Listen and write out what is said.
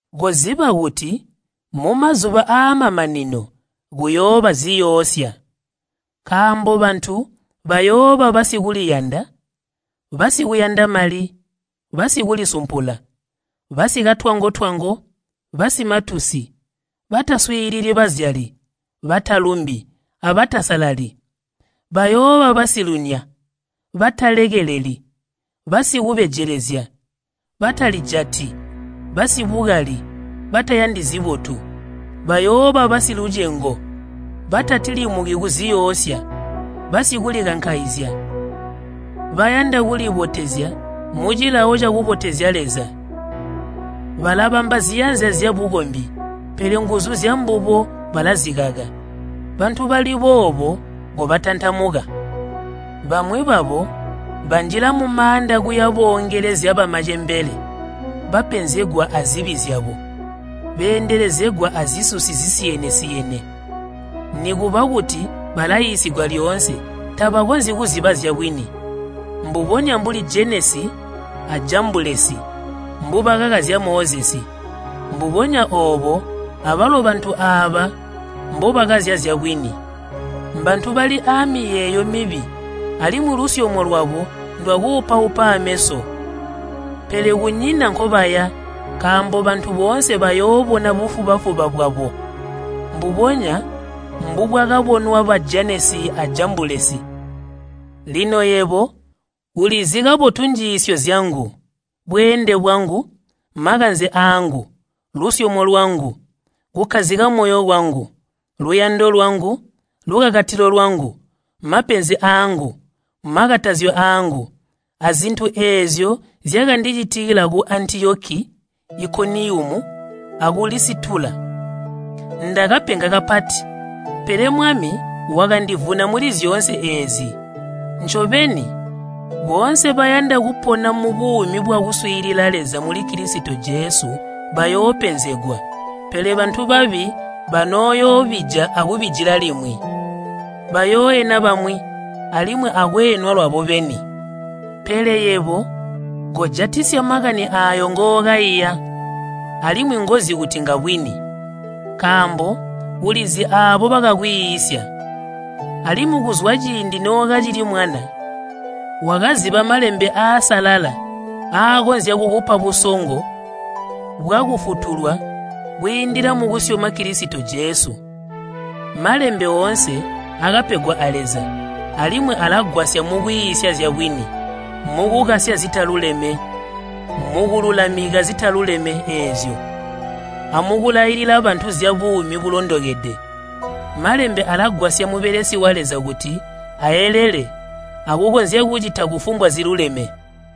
Koziba kuti mumazuba aamamanino kuyooba ziyoosya. Nkaambo bantu bayooba basikuliyanda, basikuyanda mali, basikulisumpula, basikatwango-twango, basimatusi, bataswiilili bazyali, batalumbi, abatasalali. Bayooba basilunya, batalekeleli, basikubejelezya, batalijati, basibukali, batayandi zibotu. Bayooba basilucengo, batatilimuki kuziyoosya, basikulikankaizya, bayanda kulibotezya mucilawo cakubotezya Leza. Balabamba ziyanza zyabukombi, pele nguzu zyambubo balazikaka. Bantu bali boobo kobatantamuka. Bamwi babo banjila mumaanda kuya boongelezya bamacembele bapenzegwa azibi zyabo beendelezegwa azisusi zisiyene-siyene. Nikuba kuti balaiisigwa lyoonse tabakonzyi kuziba zyabwini. Mbubonya mbuli Jenesi a Jambulesi mbubakakazya Mozesi, mbubonya oobo abalo bantu aaba mbobakazya zyabwini. Mbantu bali amiyeeyo mibi alimwi lusyomo lwabo ndwakuupaupa aameso. Pele kunyina nkobaya, nkaambo bantu boonse bayoobona bufuba-fuba bwabo, mbubonya mbubwakabonwa ba Jenesi a Jambulesi. Lino yebo ulizi kabotu njiisyo zyangu, bweende bwangu, makanze aangu, lusyomo lwangu, kukkazika moyo kwangu, luyando lwangu, lukakatilo lwangu, mapenzi aangu, makatazyo aangu, azintu eezyo zyakandicitikila ku Antiyoki, Ikoniyumu, aku Lisitula. Ndakapenga kapati, pele Mwami wakandivuna muli zyoonse eezi! Ncobeni, boonse bayanda kupona mubuumi bwakuswiilila Leza muli Kilisito Jesu bayoopenzegwa. Pele bantu babi banooyoobija akubijila limwi. Bayooena bamwi alimwi akweenwa lwabo beni. Pele yebo kojatisya makani aayo ngookaiya, alimwi ngozi kuti ngabwini. Nkaambo ulizi aabo bakakwiisya, alimwi kuzwa ciindi nookacili mwana wakaziba Malembe aasalala aakonzya kukupa busongo bwakufutulwa kwiindila mukusyoma Kilisito Jesu. Malembe oonse akapegwa a Leza alimwi alagwasya mukwiisya zyabwini, mukukasya zitaluleme, mukululamika zitaluleme eezyo, amukulailila bantu zyabuumi bulondokede. Malembe alagwasya mubelesi wa Leza kuti aelele akukonzya kucita kufumbwa ziluleme.